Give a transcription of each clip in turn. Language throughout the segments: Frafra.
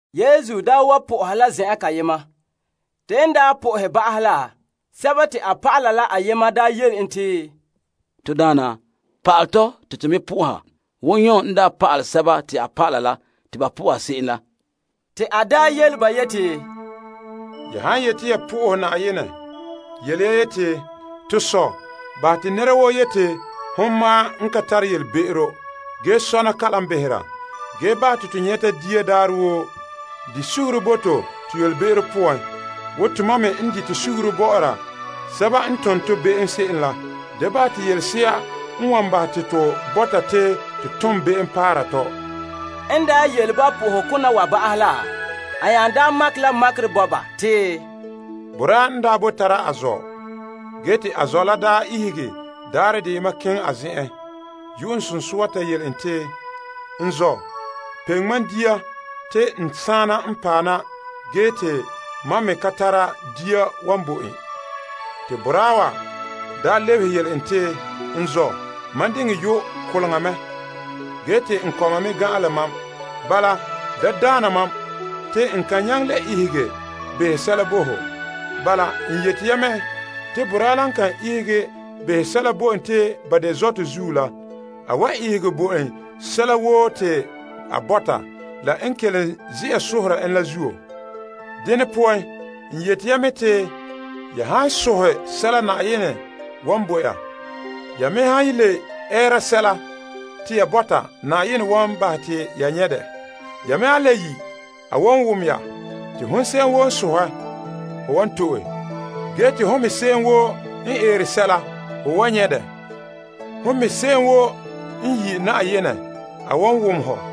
Yesu daa wa soha la zen'en kayema. Te n ta sohɛ ba'ahɛ la, a dɔlɔba la ayema yele en yeti, To Daana, pa'alɛ tɔ te to me soha wo Yon n pa'alɛ a dɔlɔba la te ba soha se'em la. Te a yele ba yeti, Ya han yete ya sohɛ Na'ayenɛ yele ya yeti, To Sɔ', bahɛ te yu'urɛ sɔna na'ahegɔ te ho sɔ'ɔlom wa'ana. Ge bahɛ te to nyɛta dia daarɛ woo. Bahɛ to be'em bo to wo tomam me n dite suguru bɔ'ɔra sɛba n tom tɔ be'em se'em la. Da bahɛ te to kɛn' pan'ahegɔ poan. En daa yele ba po'ohokona wa ba'ahɛ la, a nya yeti, Boraa n boe tara a zɔ'. Ge te a ihege daarɛ deyema keŋɛ a zen'en yu'uŋsunsua ta yele en te, N zɔ', peŋe mam dia te n saana n paɛ na ge te mam me ka tara dia wan bo en. Te a lebehe yele en te, N zɔ', mam diŋɛ yu' koleŋa mɛ ge te n kɔma me gan'an la mam. Da daana mam te n kan nyaŋɛ le ihege behɛ sɛla bo ho. Bala, n yete ya mɛ, te boraa la n kan ihege behɛ sɛla bo en te ba de zɔtɔ zuo la, a wan ihege bo en sɛla woo te a bɔta la n kelom ze'a soha en la zuo. Dene poan n yete ya mɛ te ya han sohɛ sɛla Na'ayenɛ wan bo ya. Ya me han le ɛɛra sɛla te ya bɔta Na'ayenɛ wan bahɛ te ya nyɛ' dɛ. Ya me han le yi' a wan wom ya. Te hon se'em woo n sohɛ ho wan to'e ge te hon me se'em woo n eere sɛla ho wan nyɛ' dɛ. Hon me se'em woo n yi' Na'ayenɛ a wan wom hɔ.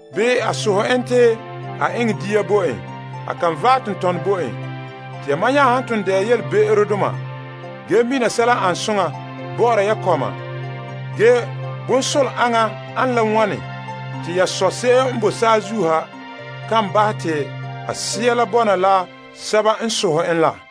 Bii a sohɛ en gele te a dekɛ naŋa bo en. Te yamam nya han ton de'a yelebe'erodoma ge mina sɛla n an soŋa bɔ'ɔra ya kɔma ge bonsola aŋa ane la wane te ya Sɔ' se'em n boe saazuo ha kan bahɛ te a Sea la bɔna la sɛba n sohɛ en la.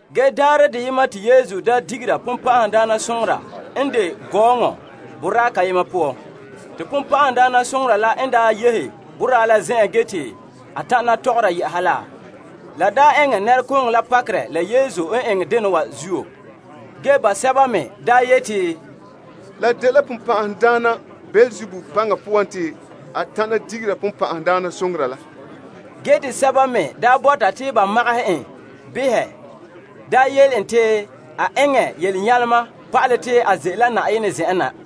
Ge daarɛ deyema te Yesu daa digera bonbe'a n ete nɛreba gɔɔnɔ boraa kayema zen'en. Te bonbe'a la n daa yehe boraa la zen'en ge te a tana tɔgɔra yɛ'ɛha la, la eŋɛ nɛrekooŋɔ la pakerɛ la Yesu n eŋɛ dena wa zuo. Ge basɛba me yeti, La dela Beelzebul se'em n behere bonbɛ'ɛhe la paŋa poan te a tana digera bonbe'a la. Ge te sɛba me bɔta te ba magahɛ en behɛ yele en te a eŋɛ yelenyalema pa'alɛ te a ze'ele la Na'ayenɛ zen'en na.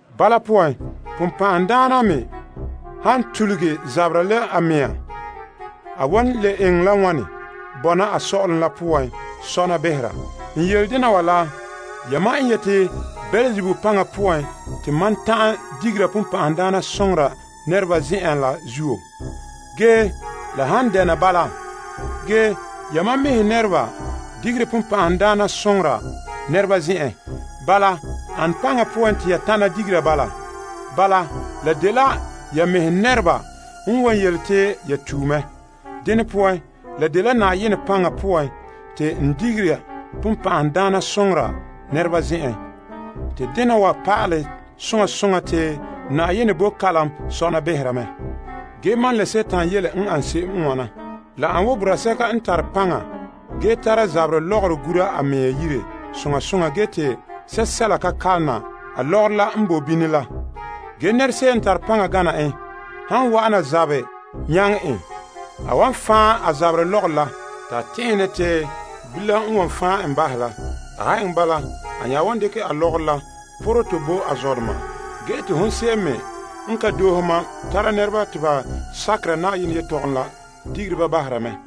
Bala poan Dima me han tuluge zabera la a mea a wan le eŋɛ la wane bɔna a sɔ'ɔlom la poan sɔna behera? N yele dena wa la yamam n yeti Beelzebul paŋa poan te mam ta'an digera bonbe'a nɛreba zen'en la zuo. Ge la han dɛna bala, ge yamam mɛhe nɛreba digere bonbe'a nɛreba zen'en. Bala ane paŋa poan te ya tana digera bala? Bala, la dela ya mɛhe nɛreba n wan yele te ya tue mɛ. Dene poan, la dela Na'ayenɛ paŋa poan te n digera bonbe'a nɛreba zen'en. Te dena wa pa'alɛ soŋa soŋa te Na'ayenɛ boe kalam sɔna behera mɛ. Ge mam la Dima yele n an se'em n wana. La an wo boraa sɛka n tare paŋa ge tare a zaberɛ lɔgɔrɔ gura a yire soŋa soŋa ge te sɛla ka kalona a lɔgɔrɔ la n bo bini la. Ge nɛra se'em n tare paŋa gana en han wa'ana zabɛ nyaŋɛ en, a wan fan' a zaberɛ lɔgɔrɔ la te a tɛn'ɛhe ne te bilam n wan fan' en bahɛ la. A han eŋɛ bala, a nya wan dekɛ a lɔgɔrɔ la porɛ tɔ bo a zɔdoma. Ge te hon se'em me n ka doohe mam tara nɛreba te ba sakera Na'ayenɛ yelehom la digere ba bahera mɛ.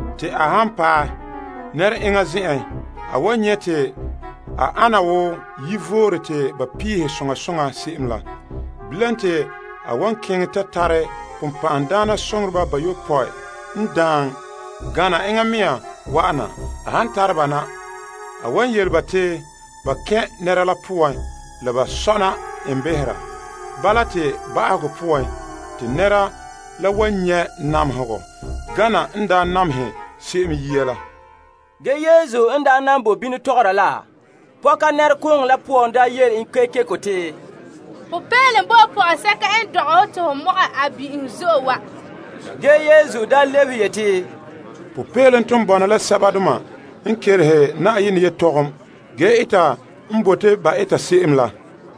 Te a han paɛ nɛra enŋa zen'en, a wan nyɛ' en te a ana wo yivore te ba peehɛ soŋa soŋa se'em la. Bilam te a wan keŋɛ ta tare bonbɛ'ɛhe bayopɔe n daan gana enŋa mɛŋa wa'ana. A han tare ba na, a wan yele ba te ba kɛn' nɛra la poan la ba sɔna en behera. Bala te ba'ahegɔ poan te nɛra la wan nyɛ' namehegɔ gana n daa namehe se'em yia la. Ge Yesu n daa nan boe bini tɔgɔra la, pɔka nɛrekooŋɔ la poan daa yele en kekeko te, Popeelom bo pɔgɔsɛka n dɔgɛ hɔ te ho mɔgɛ a bin'ihom zo'e wa! Ge Yesu lebehe yeti, Popeelom ton bɔna la sɛba n kelehere Na'ayenɛ yelehom ge eta n bote ba eta se'em la.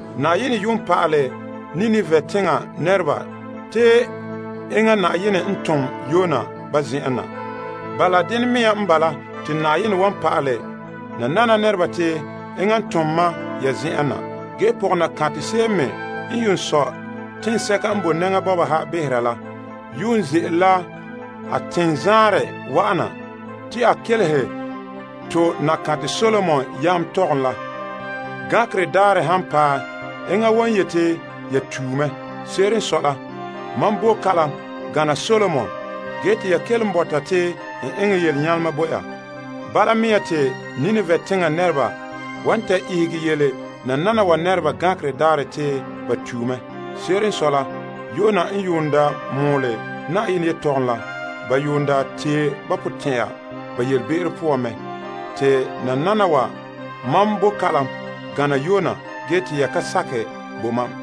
Na'ayenɛ daa pa'alɛ Nineveh teŋa nɛreba te enŋa Na'ayenɛ n tom Yona ba zen'en na. Bala dene mea n bala te Na'ayenɛ wan pa'alɛ nanana nɛreba te enŋa n tom Asaala Dayɔa wa ya zen'en na. Ge pɔgɔnaba se'em me n daa sɔe teŋsɛka n boe gɔbega bɔba ha behera la, ze'ele a teŋzaanrɛ wa'ana te a kelehe to Nakantɛ Solomon yam yelehom la. Gankerɛ daarɛ han paɛ, enŋa wan yete ya tue mɛ. Se'ere n sɔe la, mam bo kalam gana Solomon ge te ya kelom bɔta te n eŋɛ yelenyalema bo ya. Bala mea te Nineveh teŋa nɛreba wan ta ihege yele nananawa nɛreba gankerɛ daarɛ te ba tue mɛ. Se'ere n sɔe la, Yona n daa mɔɔlɛ Na'ayenɛ yelehom la, ba daa tee ba potɛn'ya ba yelebe'ero poan mɛ. Te nananawa mam bo kalam gana Yona ge te ya ka sakɛ bo mam.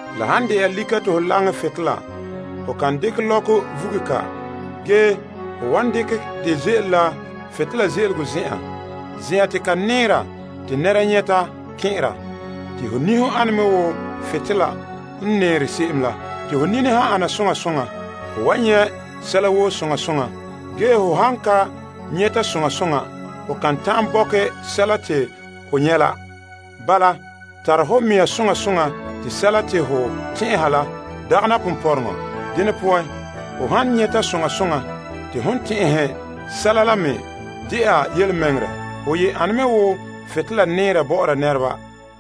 La han de'a lika te ho laŋɛ butolela, ho kan dekɛ lɔkɔ vuge ka. Ge ho wan dekɛ dɛ ze'ele la butolela ze'elego zen'en, zen'an te ka nɛɛra te nɛreba nyɛta kɛn'ɛra. Te ho niho ane me wo butolela n nɛɛre se'em la. Te ho nini han ana soŋa soŋa, ho wan nyɛ' sɛla woo soŋa soŋa. Ge ho han ka nyɛta soŋa soŋa, ho kan ta'an bɔkɛ sɛla te ho nyɛ' la. Bala tare ho mea soŋa soŋa te sɛla te ho tɛn'ɛha la dagana ponpɔrɔŋɔ. Dene poan, ho han nyɛta soŋa soŋa te hon tɛn'ɛhe sɛla la me de'a yelemɛŋɛrɛ, ho ye ane me wo butolela nɛɛra bɔ'ɔra nɛreba.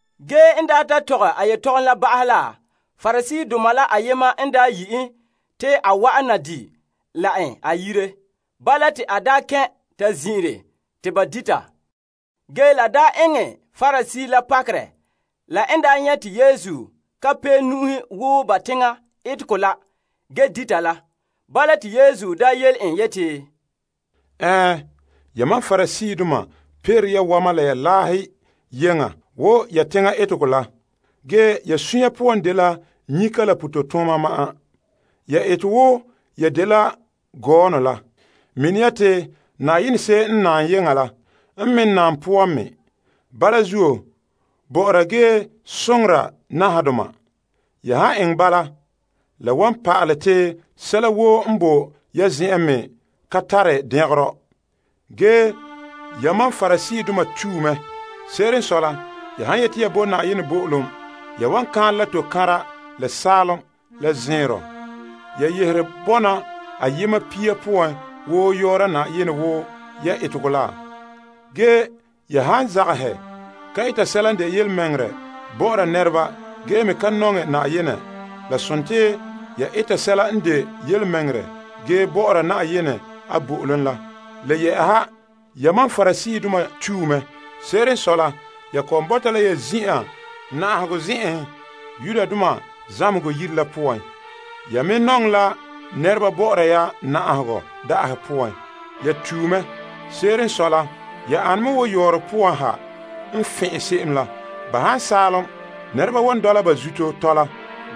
Ge en daa ta tɔgɛ a yetɔgom la ba'ahɛ la Pariseedoma la ayema n daa yi' en te a wa'an na di' la en a yire. Bala te a kɛn' ta zin'ire te ba dita. Ge la eŋɛ Parisee la pakerɛ la n nyɛ' te Yesu ka pee nu'uhe wo ba teŋa etegɔ la ge dita la. Bala te Yesu yele en yeti, Ɛɛn, yamam Pariseedoma peere ya wama la ya laahe yeŋa wo ya teŋa etegɔ la. Ge ya sunya poan dela nyika la pototooma ma'an. Ya ete wo ya dela gɔɔnɔ la. Mina ya te Na'ayenɛ se'em n naam yeŋa la n me naam poan me. Bala zuo, bɔ'ɔra ge soŋora nahadoma. Ya han eŋɛ bala, la wan pa'ale te sɛla woo n boe ya zen'en me ka tare dɛngerɔ. Ge yamam Pariseedoma tue mɛ. Se'ere n sɔe la, ya han yete ya bo Na'ayenɛ bo'olom ya wan kaanlɛ ya tokanra, la saalom, la zɛnrɔ, ya yehere bonɔ ayema pia poan woo yɔɔra Na'ayenɛ wo ya etegɔ la. Ge ya zagahɛ ka eta sɛla n de yelemɛŋɛrɛ bɔ'ɔra nɛreba ge me ka nɔŋɛ Na'ayenɛ. La dela ya eta sɛla n de yelemɛŋɛrɛ ge bɔ'ɔra Na'ayenɛ a bo'olom la. Le yɛ'ɛha yamam Pariseedoma tue mɛ. Se'ere n sɔe la, ya kɔ'ɔn bɔta la ya zin'an na'ahegɔ zen'enhen zamehegɔ yire la poan. Ya me nɔŋɛ nɛreba bɔ'ɔra ya na'ahegɔ da'ahe poan. Ya tue mɛ. Se'ere n sɔe la, ya ane me wo yɔɔrɔ poan ha n fɛn'ɛn se'em la. Ba han saalom, nɛreba wan dɔla ba zuto tɔla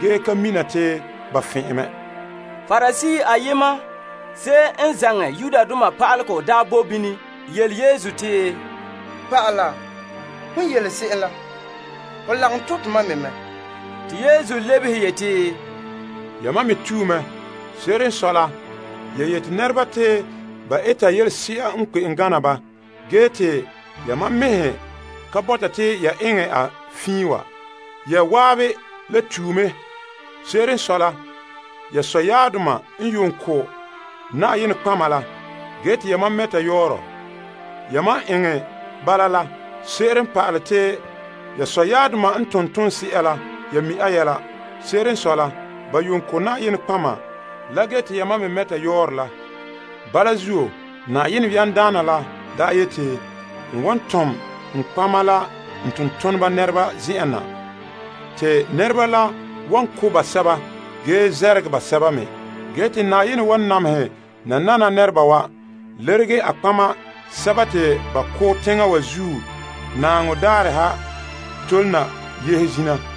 ge kan mina te ba fɛn'ɛn mɛ. Parisee ayema, se'em n zaŋɛ pa'alegɔ la daa boe bini yele Yesu te, Pa'ala, hon yele se'em la ho lagom to' tomam me mɛ. Te Yesu lebehe yeti, Yamam me tue mɛ. Se'ere n sɔe la, ya yete nɛreba te ba eta yelese'a n kpe'em gana ba ge te yamam mɛhe ka bɔta te ya eŋɛ a fiin wa. Ya zan'an le tue mɛ. Se'ere n sɔe la, ya sɔyaabdoma n yuun ko' nɔtɔgɔheba la, ge te ya mam mɛta yɔɔrɔ bɔ'ɔra nɔtɔgɔheba la. Yamam n eŋɛ bala la seren pa'alɛ te ya sɔyaabdoma n tom ton se'a la ya mi' a yɛla. Se'ere n sɔe la, ba yuun ko' nɔtɔgɔheba la ge te yamam me mɛta ba yɔɔrɔ. Bala zuo Na'ayenɛ n de yamdaana la yeti, N wan tom n nɔtɔgɔheba la n tontoneba nɛreba zen'en na, te nɛreba la wan ko' basɛba ge namehɛ basɛba me. Ge te n wan namehɛ nanana nɛreba wa lerege a nɔtɔgɔheba sɛba te ba ko' teŋa wa zuo naaŋɔ daarɛ ha tole na yehe zina.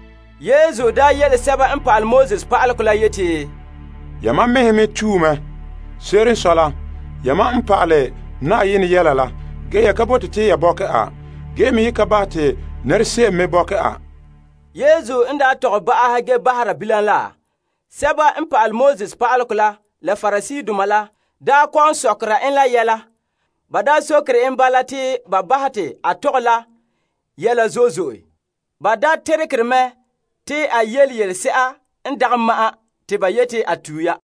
Yesu daa le yele pa'alegɔ pa'aleba la yeti, Yamam mɛhe me tue mɛ. Se'ere n sɔe la, yamam n pa'ale Na'ayenɛ yelehom la, ge ya ka bote te ya bɔkɛ a ge me ye ka bahɛ te nɛra se'em me bɔkɛ a. Yesu n daa tɔgɛ ba'ahɛ ge bahera bilam la, pa'alegɔ pa'aleba la la Pariseedoma la kɔ'ɔn sokera en la yɛla. Ba sokere en bala te ba bahɛ te a tɔgɛ la yɛla zo'e zo'e. Ba teregere mɛ te a yele yelese'ere n dagɛ ma'an te ba yeti a tue ya.